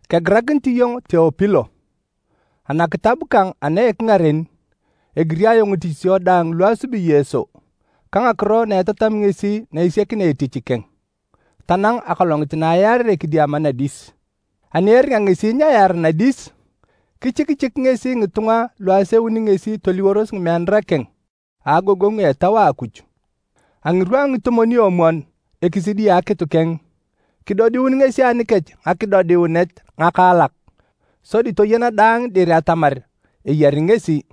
Kegirakinit iyong Teopilo. Anakitab kang ana a ekingaren, egiri ayong ngitichisio daang lu asubi Yesu ka ngakiro na etatami ngesi na esiakinea etich keng tanang akolongit na ayaarere kidiama nadis. Ani eringa ngesi nyeyaara nadis, kichikichik ngesi ngitunga lu aseuni ngesi toliworos ngimeanara keng, a agogongu a Etau a Akuj. A ngirwa a ngitomwon-omwon ekisidi a akitu keng, kidodiun ngesi anikech ngakidodiunet ngakaalak, sodi toyana daang dir atamar eyari ngesi.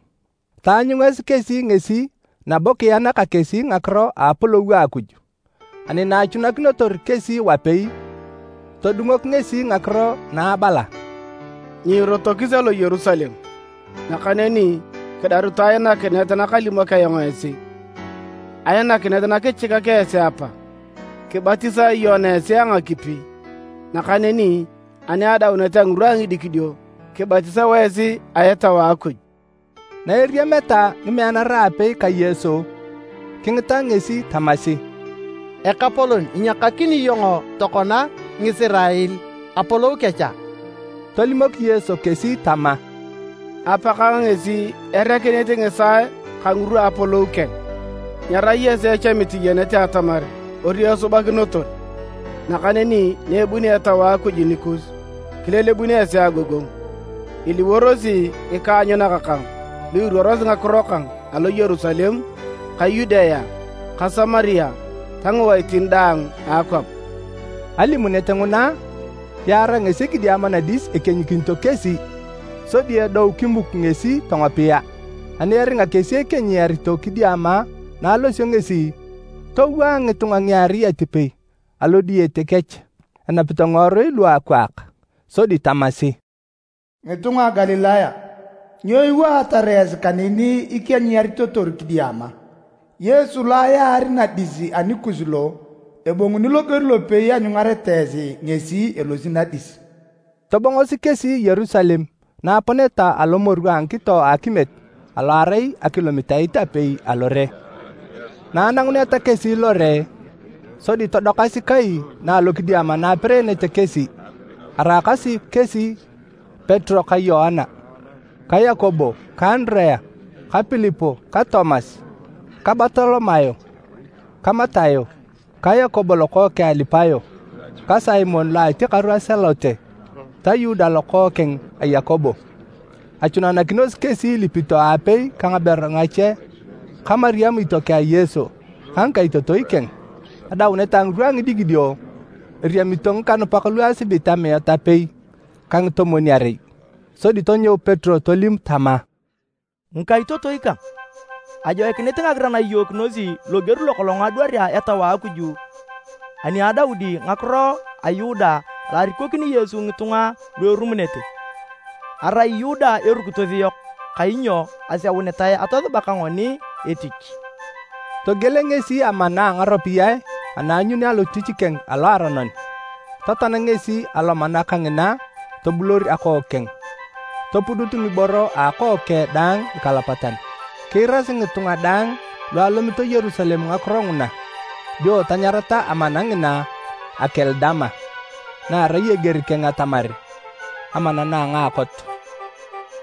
Taanyungasi kesi ngesi nabo kiyana ka kesi ngakiro a Apolou a Akuj. Ani na achunakinotor kesi wapei, todungok ngesi ngakiro na abala, “Nyiirotokis alo Yerusalem, nakaneni kidarutu ainakinet nakalimok ayong esi, ainakinet nakichikak esi Apa. Kibatisae Yoana esi a ngakipi, nakaneni ani adaunet a ngirwa a ngidikidio, kibatisao esi a Etau a Akuj.” Na eriameta ngimeanara aapei ka Yesu, kingita ngesi tamasi, “Ekapolon, inyiakakini iyong tokona Ngisirael Apolou kech a?” Tolimok Yesu kesi tama, “Apakang ngesi erekinit ngisaae ka ngirwa a apolou keng, nyerai esi echamit iyenete atamar ori esubakinotor. Nakaneni na ebunio Etau a Akuj nikus, kilelebun esi agogongu. Iliworosi ngikaanyunak kang lu iruorosi ngakiro kang alo Yerusalem ka Yudea ka Samaria ta ngiwaitin daang a akwap.” Alimunet nguna, yaarae ngesi kidiama nadis ekienyikinito kesi. Sodi edou kimuk ngesi tongopia. Ani eringa kesi ekienyiyarito kidiama na alosio ngesi, towaa ngitunga ngiarei atipei alo diyete kech enapito ngiworui luakwaak. Sodi tamasi, “Ngitunga a Galilaya, nyo iwaatar esi kaneni ikienyiyaritotor kidiama? Yesu lo ayaar nadis anikus lo, ebonguni loger lopei ianyungareta esi ngesi elosi nadis.” Tobongosi kesi Yerusalem na aponeta alo Moru a ngikito a akimiet alo arai akilomitait apei alore. Na ananguneta kesi lore, sodi todokasi kai na alokidiama na apereenete kesi. Araakasi kesi Petero ka Yoana ka Yakobo ka Andirea ka Pilip ka Tomas ka Bartolomayo ka Matayo ka Yakobo lokookeng a Alipayo ka Simon lo a atiakaru a Salote ta Yuda lokookeng a Yakobo. Achunanakinosi kesi ilipito aapei ka ngaberu ngache ka Mariam itiokeng a Yesu ka ngikaitotoi keng. Adaunet a ngirwa a ngidikidio, eriamito ngikanupak lu asibit amiat apei ka ngitomwon-arei. Sodi tonyou Petero tolim tama, “Ngikaitotoi kang, ajoikinit ngagiran iyookinosi loger lokolong adwarea Etau a Akuj ani a Daudi ngakiro a Yuda alo arikokini Yesu ngitunga lu erumunete. Arai Yuda erukitos yok kainyo aseunitae atosuba ka ngoni etich.” ( Togiel ngesi amana a ngaropiyae ana aanyuni alotich keng a loaronon, totoan ngesi alomana kangina tobulor akook keng, topudut ngiboro a akook keng daang nikalapatan. Kiirasi ngitunga daang lu alomito Yerusalem ngakiro nguna, dio tanyarata amana ngina, “Akel Dama,” na erai eger keng atamar, “Amana na a ngaakot.”)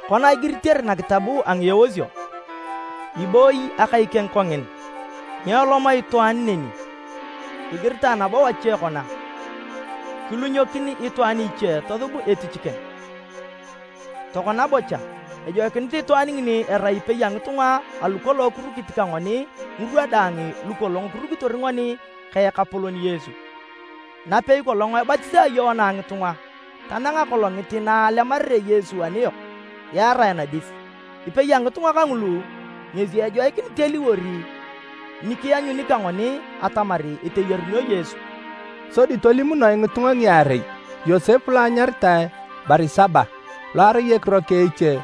“Kona igiritere nakitab a Ngieosio, ‘Ibooyi akai keng kongin, nyeelom itwaan neni.’ Igiritae nabo wache kona, ‘Kilunyokin itwaan iche tosub etich keng.’ “Tokona bocha, ejoikinit itwaan ngini erai ipei a ngitunga alu kolong kirukit ka ngoni ngirwa daang lukolong kirukitor ngoni ka Ekapolon Yesu, napei kolong ebatisaa Yoana ngitunga, tanang akolongit na alemarere Yesu aniyok yaarae nadis. Ipei a ngitunga kangulu ngesi ejoikinit eliwor ni kianyuni ka ngoni atamar eteyarunio Yesu.” Sodi tolimunoe ngitunga ngiarei, Yosep lo anyaritae Barisaba (lo arai ekiro eche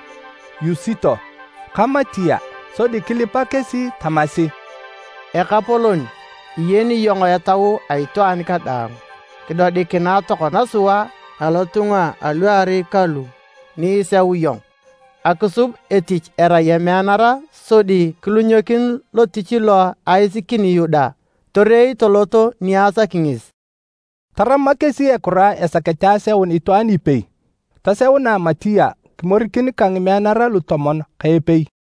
Yusito) ka Matia. Sodi kilipa kesi tamasi, “Ekapolon, iyeni iyong etau a itwaan kadaang, kidodikinae tokona sua alotunga aluarei kalu ni iseu iyong akisub etich erai emeanara sodi kilunyokin lotich lo aisikini Yuda torei tolot ni asaki ngesi.” Tarama kesi ekura esakete aseun itwaan ipei. Toseunae Matia kimorikin ka ngimeanara lutomon ka epei.